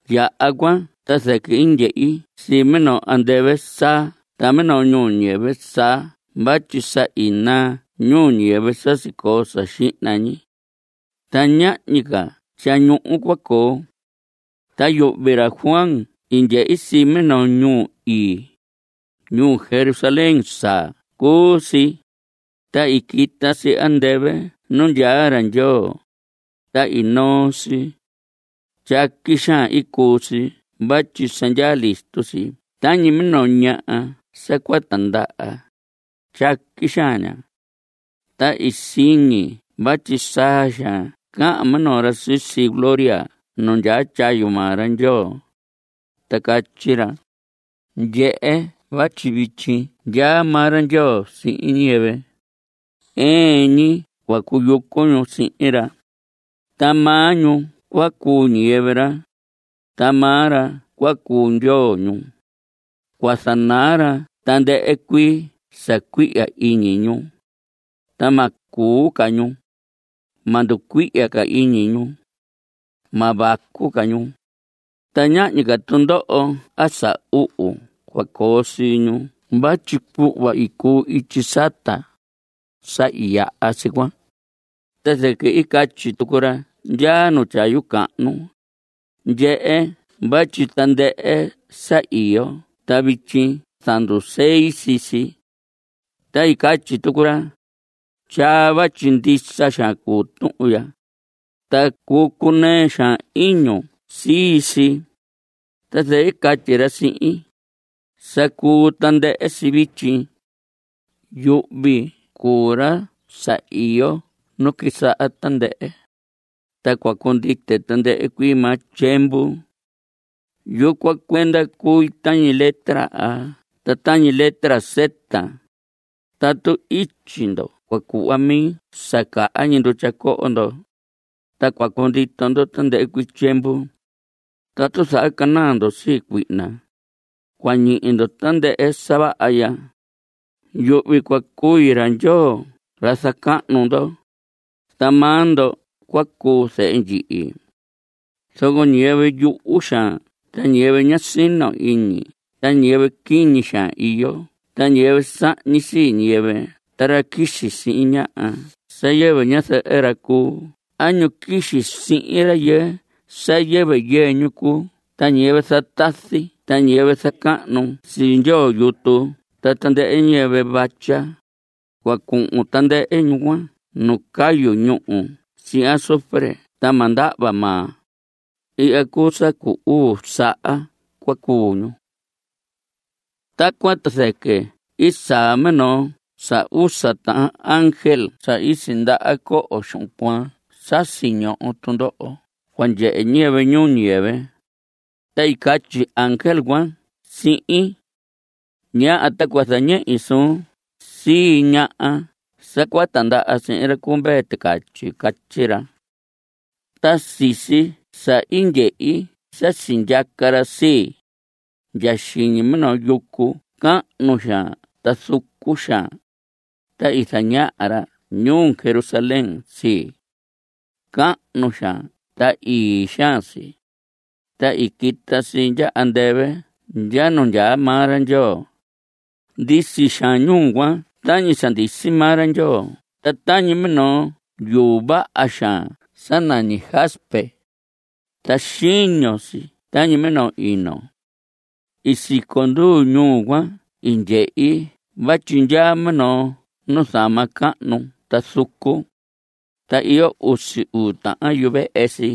Yaha cuan ta zɨquɨ i ndyehi sii minoo andɨvɨ saa ta minoo ñuu ñiyɨvɨ saa vatyi sa i naa ñuu ñiyɨvɨ sa sicoo sa xihna ñi. Ta ñahñi ca tyañuhu cua coo. Ta yuhvi ra Juan i ndyehi sii minoo ñuu ii, ñuu Jerusalén saa cuu si, ta i quita si andɨvɨ nu ndyaa ra Ndyoo, ta i noo si. Tyaqui xaan i cuu si vatyi sa ndyaa listo si tañi minoo ñaha sa cua tandaha, tyaqui xaan ña. Ta i siñi vatyi saa xaan cahan minoo ra sisi gloria nu ndyaa tyayu maa ra Ndyoo, ta catyi ra: Ndyehe vatyi vityi ndyaa maa ra Ndyoo sihin ñiyɨvɨ. Ɨɨn ñi cua cuyucu ñu sihin ra. Maa ñu cua cuu ñiyɨvɨ ra, ta maa ra cua cuu Ndyoo ñu. Cua zanaa ra tandɨhɨ cuii sa cuihya iñi ñu, ta ma cuu ca ñu. Ma nducuihya ca iñi ñu. Ma vacu ca ñu, ta ñahñi ca tundoho a sa uhu cua coo sii ñu vatyi cuhva i cuu ityi sata, sa i yaha si cuan. Ta zɨquɨ i catyi tucu ra ndyaa nu tyayu cahnu: Ndyehe vatyi tandɨhɨ sa iyo ta vityi zandusei sii si. Ta i catyi tucu ra: Tyaa, vatyi ndisa xaan cuu tuhun ya, ta cuu cunɨɨ xaan iñun sii si. Ta zɨquɨ i catyi ra sihin: Sa cuu tandɨhɨ si vityi. Yuhvi cuu ra sa iyo nu quisaha tandɨhɨ, ta cua cundite tandɨhɨ cuii maa tyiemvu. Yucuan cuenda cui tañi letra A ta tañi letra Z. Tatu ityi ndo cua cuhva mi sa caha ñi ndutya coho ndo, ta cua cundito ndo tandɨhɨ cuii tyiemvu. Tatu zahacanaa ndo sii cuihna, cua ñihi ndo tandɨhɨ sa vaha ya. Yuhvi cua cui ra Ndyoo ra zacahnu ndo, ta maa ndo cua cuu zehe ndyihi. Zoco ñiyɨvɨ yuhu xaan ta ñiyɨvɨ ña sino iñi ta ñiyɨvɨ quiñi xaan iyo ta ñiyɨvɨ sahñi sii ñiyɨvɨ ta ra quixi sihin ñaha sa yɨvɨ ñazɨhɨ ra cuu a ñu quixi sihin rayɨɨ sa yɨvɨ yɨɨ ñu cuu ta ñiyɨvɨ zatazi ta ñiyɨvɨ zacahnu sii ndyoo yutu ta tandɨhɨ ñiyɨvɨ vatya, cua cuhun tandɨhɨ ñu cuan nu cayu ñúhu sihin azufre sa ma ndahva maa. Ihya cuu sa cu uu saha cua cuu ñu. Tacuan ta zɨquɨ i saa minoo sa usa tahan ángel sa i sindaha coho xuhun cuaan sa siñoho tundoho cua ndyehe ñiyɨvɨ ñuu ñiyɨvɨ, ta i catyi ángel cuan sihin: Ñaha ta cua zañehi suun sii ñaha sa cua tindaha sihin ra cu Mvee Ticatyi. Catyi ra. Ta sisi sa i ndyehi sa sindyaca ra sii, ndya xiñi minoo yucu cahnu xaan ta zucu xaan, ta i zañaha ra ñuu Jerusalén sii. Cahnu xaan ta ii xaan si, ta i quita si ndya andɨvɨ ndya nu ndyaa maa ra Ndyoo. Ndisi xaan ñuu cuan tañi sa ndisi maa ra Ndyoo ta tañi minoo yuu vaha xaan sa nañi jaspe. Ta xiño si tañi minoo ino. Siconduu ñuu cuan i ndyehi vatyi ndyaa minoo nuzama cahnu ta zucu. Ta iyo usi uu tahan yuvehe si.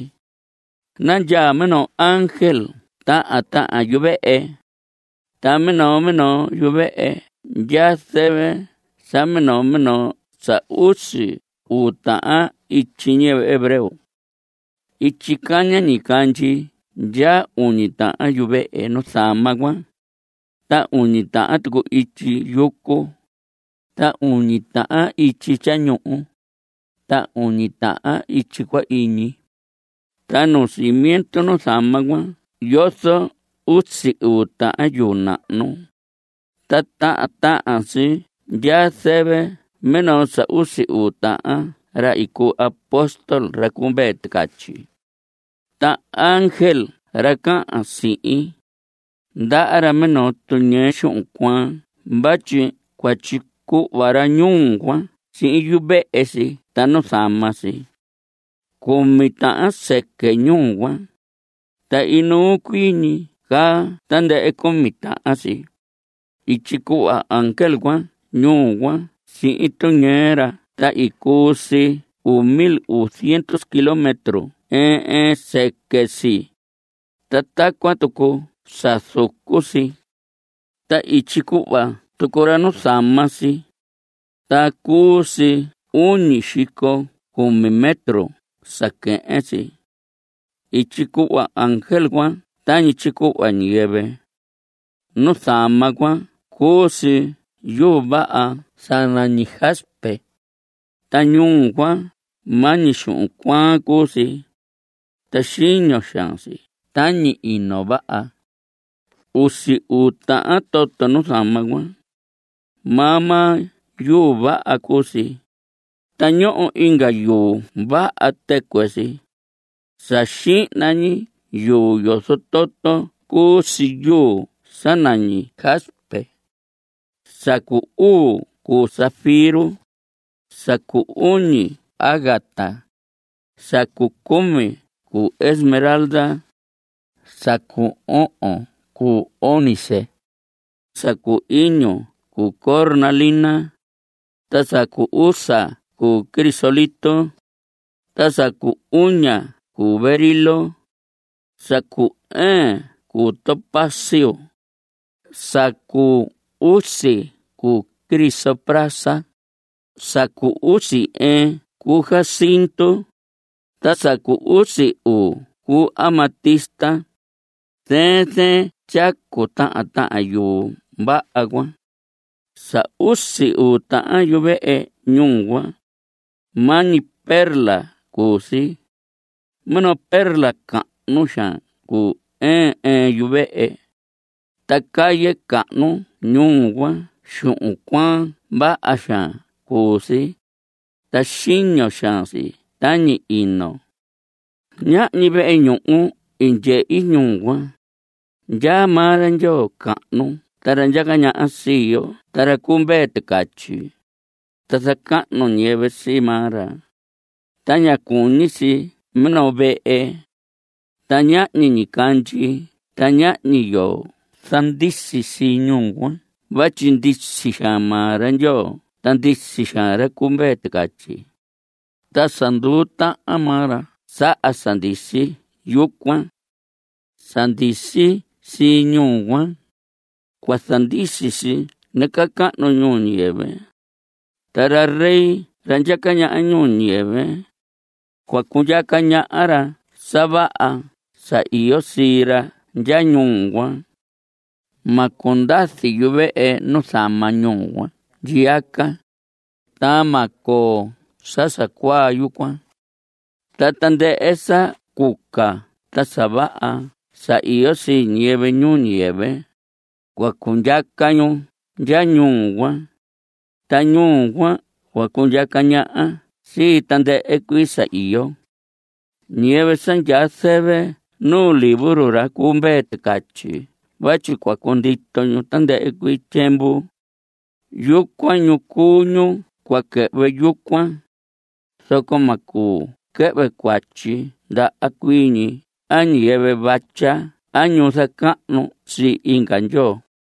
Nandyaa minoo ángel tahan tahan yuvehe. Ta minoo minoo yuvehe ndyaa zɨvɨ sa minoo minoo sa usi uu tahan ityi ñiyɨvɨ hebreo. Ityi caña ñicandyi ndyaa uñi tahan yuvehe nuzama cuan, ta uñi tahan tucu ityi yucu, ta uñi tahan ityi tyañuhu, ta uñi tahan ityi cua iñi. Nu cimiento nuzama cuan yozo usi uu tahan yuu nahnu, ta tahan tahan si ndyaa zɨvɨ minoo sa usi uu tahan ra i cuu apóstol ra cu Mvee Ticatyi. Ra ángel ra cahan sihin, ndaha ra minoo tuñɨɨ xuhun cuaan vatyi cua tyicuhva ra ñuu cuan sihin yuvehe si ta nuzama si. Cumi tahan sɨquɨ ñuu cuan, ta inuu cuii ñi caa tandɨhɨ cumi tahan si. I tyicuhva ángel cuan ñuu cuan sihin tuñɨɨ ra ta cuu si uu mil uu ziendu kilómetro ɨɨn ɨɨn sɨquɨ si, ta tacuan tucu sa zucu si. Ta i tyicuhva tucu ra nuzama si, ta cuu si uñi xico cumi metro sa quehen si. I tyicuhva ángel cuan tañi tyicuhva ñiyɨvɨ. Nuzama cuan cuu si yuu vaha sa nañi jaspe, ta ñuu cuan maa ñi xuhun cuaan cuu si, ta xiño xaan si tañi ino vaha. Usi uu tahan toto nuzama cuan. Maa maa yuu vaha cuu si, ta ñoho inga yuu vaha tɨcuɨ si. Sa xihna ñi yuu yozo toto cuu si yuu sa nañi jaspe. Sa cu uu cuu zafiro. Sa cu uñi cuu ágata. Sa cu cumi cuu esmeralda. Sa cu ohon cuu ónice. Sa cu iñu cuu cornalina. Sa cu usa cuu crisólito. Sa cu uña cuu berilo. Sa cu ɨɨn cuu topacio. Sa cu usi cuu crisoprasa. Sa cu usi ɨɨn cuu jacinto. Ta sa cu usi uu cuu amatista. (Zɨɨn zɨɨn tyacu tahan tahan yuu vaha cuan.) Sa usi uu tahan yuvehe ñuu cuan, maa ñi perla cuu si. Minoo perla cahnu xaan cuu ɨɨn ɨɨn yuvehe. Ta calle cahnu ñuu cuan xuhun cuaan vaha xaan cuu si, ta xiño xaan si tañi ino. Ñahñi vehe ñuhu i ndyehi ñuu cuan. Ndyaa maa ra Ndyoo Cahnu ra ndyaca ñaha sii yo ta ra cu Mvee Ticatyi, ta zacahnu ñiyɨvɨ sii maa ra, ta ña cuñi si minoo vehe. Ta ñahñi ñicandyi ta ñahñi yoo zandisi sii ñuu cuan vatyi ndisi xaan maa ra Ndyoo ta ndisi xaan ra cu Mvee Ticatyi, ta sa nduu tahan maa ra saha sa ndisi yucuan. Sa ndisi sii ñuu cuan, cua zandisi si nacahnu ñuu ñiyɨvɨ. Ta ra rey ra ndyaca ñaha ñuu ñiyɨvɨ, cua cundyaca ra sa vaha sa iyo sii ra ndya ñuu cuan. Ma cundazi yuvehe nuzama ñuu cuan ndyiaca. Ta ma coo sa sa cuaa yucuan. Ta tandɨhɨ sa cuca ta sa vaha sa iyo sii ñiyɨvɨ ñuu ñiyɨvɨ, cua cundyaca ñu ndya ñuu cuan, ta ñuu cuan cua cundyaca ñaha sii tandɨhɨ cuii sa iyo. Ñiyɨvɨ sa ndyaa zɨvɨ nu libro ra cu Mvee Ticatyi vatyi cua cundito ñu tandɨhɨ cuii tyiemvu, yucuan ñu cuu ñu cua quɨhvɨ yucuan, zoco ma cuu quɨhvɨ cuatyi ndaha cuii ñi a ñiyɨvɨ vatya a ñu zacahnu sii inga ndyoo.